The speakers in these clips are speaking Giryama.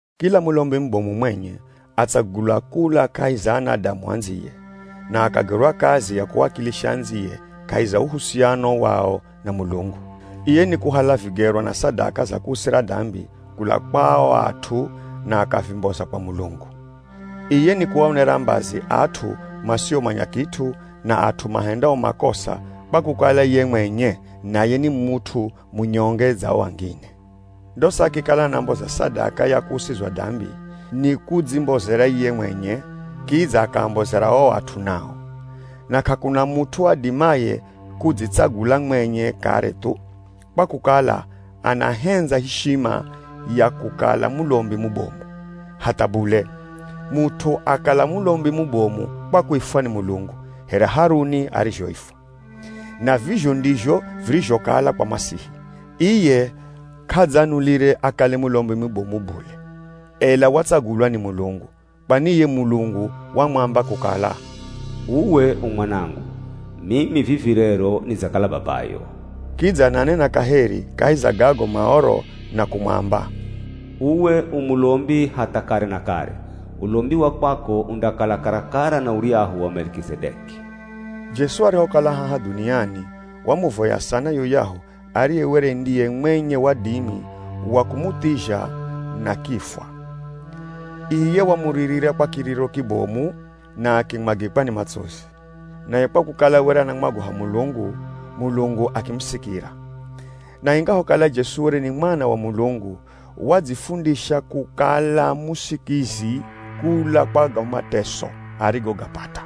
Kila mulombi mubomu mwenye atsagulwa kula kahi za anadamu andziye, na akagerwa kazi ya kuwakilisha andziye kahi za uhusiano wao na Mulungu. Iye nikuhala vigerwa na sadaka za kuusira dambi kula kwa o at'u na akavimboza kwa Mulungu. Iye nikuaonera mbazi at'u masiomanya kit'u, na at'u mahendao makosa kwa kukala ye mwenye naye ni mut'u munyonge dza o angine. Ndosa akikala anamboza sadaka ya kuusizwa dambi, nikudzimbozera ye mwenye, kidza akaambozera o at'u nao. Na k'akuna mut'u adimaye kudzitsagula mwenye kare thu, kwa kukala anahendza ishima ya kukala mulombi mubomu. Hatha bule. Mut'u akala mulombi mubomu kwa kuifwa ni Mulungu, here Haruni arizhoifwa. Na vizho ndizho virizhokala kwa Masihi. Iye k'adzanulire akale mulombi mubomu bule, ela watsagulwa ni Mulungu. Kwani iye Mulungu wamwamba kukala, “Uwe u mwanangu, mimi vivi rero nidzakala babayo.” Kidza ananena kaheri kahi za gago Maoro na kumwamba, “Uwe u mulombi hatha kare na kare, ulombi wa kwako undakala karakara na uryahu wa Melikizedeki.” Jesu arihokala haha dhuniani, wamuvoya sana yuyahu ariye were ndiye mwenye wadimi wa kumuthizha na kifwa. Iye wamuririra kwa kiriro kibomu na akimwagikwa ni matsozi. Naye kwa kukala were anamwagoha Mulungu, Mulungu akimusikira. Na ingahokala Jesu were ni Mwana wa Mulungu, wadzifundisha kukala musikizi kula kwa go mateso arigogapata.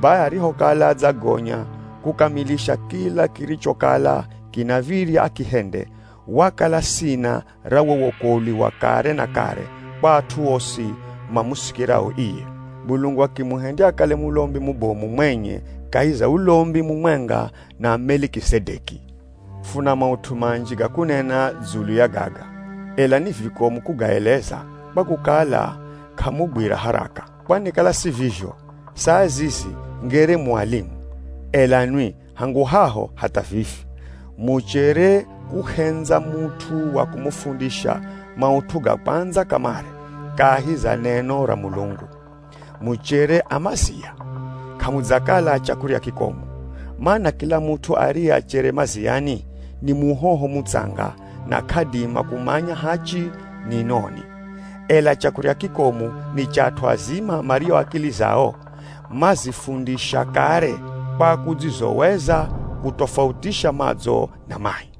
Bai arihokala adzagonya kukamilisha kila kirichokala kinav̱irya akihende, wakala sina ra wo wokolwi wa kare na kare kwa at'u osi mamusikirao iye. Mulungu akimuhendya akale mulombi mubomu mwenye kahi za ulombi mumwenga na Melikizedeki. Funa maut'u manji ga kunena dzulu ya gaga, ela ni vikomu kugaeleza, kwa kukala k'amugwira haraka. Kwani kala si vizho, saa zizi ngere mu alimu, ela nwi hangu haho hatha vivi, muchere kuhendza mut'u wa kumufundisha maut'u ga kwandza kamare kahi za neno ra Mulungu. Muchere a mazia, k'amudzakala a chakurya kikomu. Mana kila mut'u ariye achere maziani, ni muhoho mutsanga na k'adima kumanya hachi ni noni. Ela chakurya kikomu, ni cha at'u azima mario akili zao mazifundisha kare kwa kudzizoweza kutofautisha madzo na mai.